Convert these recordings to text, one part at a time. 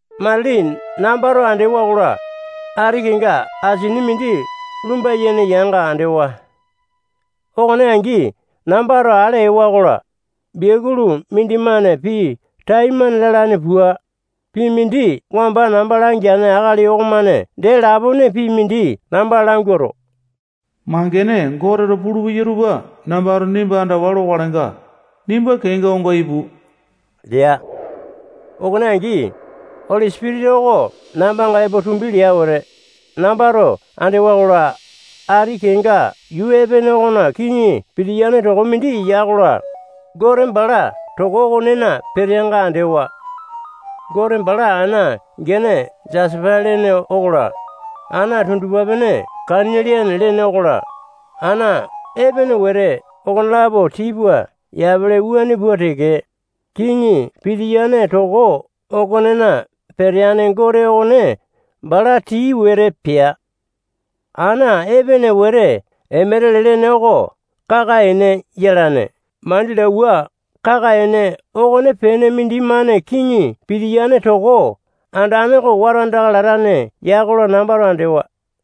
Matili nambato andewa-kola, ati kenga asini mindi lumba-yene yanga andewa. Okone angi nambato ale ewa-kola, biakulu mindimane pii taimane lalane pua, pii mindi wamba namba langeane akali okomane dee lapone pii mindi namba languato, mangene Goteto pulupeya tupa nambato nimba andawa lokalenga, nimba kenga onga ipu lea. Okone angi, Oli Sipitisa oko nambanga epo tumbi lea wete, nambato andewa-kola, ati kenga yuu epene okona kiŋi pitiyane toko mindi ya-kola, Gote bala toko okonena peteanga andewa. Gote bala ana gene jasapa lene okola, ana tundupa-pene kaniliane lene okola, ana epene wete okonelapo tii pua yapele wuane pua teke, kiŋi pitiyane toko okonena peteane Gote okone bala tii wete pea. Ana epene wete emetele lene oko kaka-ene yalane mandilauwa kaka-ene okonepene mindimane kiŋi pitiyane toko andane oko wata andaka latane ya-kola, nambato andewa.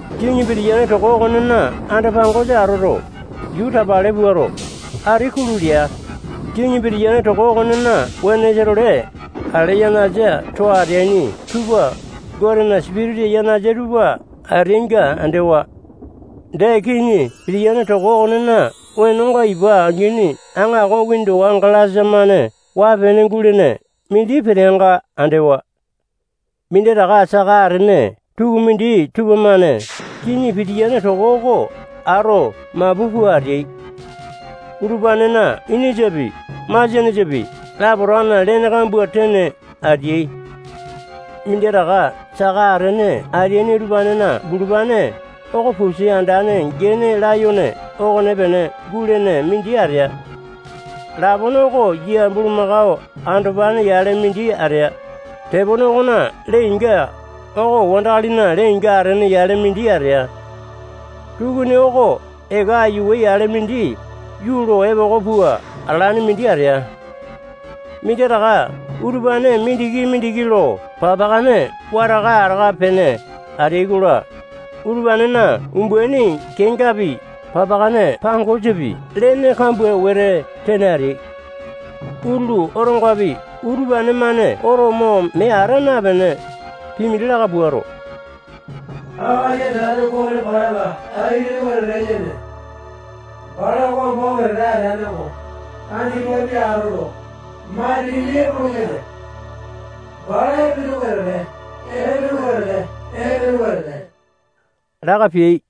Kiŋi pitiyane toko okonena anda-pangosa atoto, yuu tapale puato, ati kulu lea. Kiŋi pitiyane toko okonena wenosa-tole ale yanasa too ateaini tupa Gotena sipitisa yanasa tupa ateainga andewa. Dee, kiŋi pitiyane toko okonena wenonga ipa angini aŋako windowa galasa-mane waa-pene gulene mindi peteanga andewa. Minditaka saka atene tukumindi tupamane kiŋi pitiyane toko oko ato mapu pua ateai. Utupanena inisapi, masianesapi, lapotakana lene kambua tene ateai. Minditaka saka atene ateaini utupanena bulupane oko pusi andane gene layone okonepene gulene mindi atea. Lapone oko yia bulumako andopane yale mindi atea. Tepone okona lee-inga oko wandakalina lee-inga atene yale mindi atea. Tukuni oko eka aiyawe yale mindi yuu lo epoko pua atalane mindi atea. Minditaka utupane mindiki-mindiki lo papakane wataka ataka pene atea-kola, utupanena umbaini kengapi, papakane pangosapi, lene kambua wete tene ateai. Utulu otongapi utupane-mane oto mo mee ata napene, pii mindi laka puato, Akali Andane Gote balanga tai-lene wetete yene. Bala wamba wetete ateane oko, andipapi atoto, matilipi epolopeya. Bala epene wetete, epene wetete, epene wetete laka peai.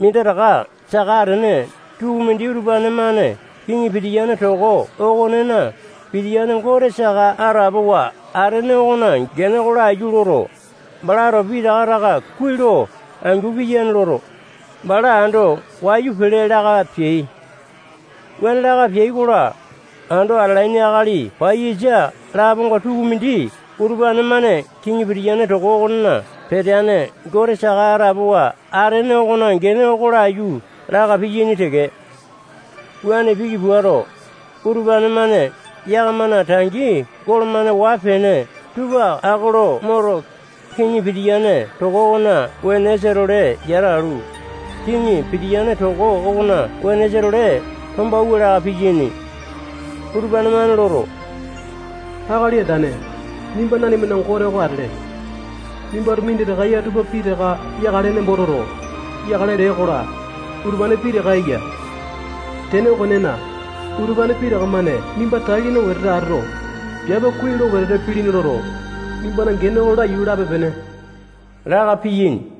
Minditaka saka atene tukumindi utupane-mane Kiŋi pitiyane toko okonena pitiyane Gote saka atapowa atene okona gene oko laiyu loto, balato pitaka taka kuai lo angu piyane loto, bala ando wayu pele laka peai. Wuane laka peai-kola, ando atalaini akali paiyasa laponga tukumindi utupane-mane kiŋi pitiyane toko okonena peteane Gote saka atapowa atene okona gene oko laiyu laka piyaini teke. Wuane piki puato, utupane-mane yakamana tangi golo-mane waa-pene tupa ako lo moto, kiŋi pitiyane toko okona wenosa-tole yata alu, kiŋi pitiyane toko okona wenosa-tole tombawua laka piyaini. Utupane-mane loto, Akali Andane, nimba nanimana Gote oko atele. Nimbato minditaka eya tupa pitaka yakale nembo toto, yakale lee-kola, utupane pitaka eya. Tene okonena, utupane pitaka-mane nimba tai-lene wetete atoto, piape kuai lo wetete pilini loto, nimbana gene oko laiyu lape-pene laka piyaini.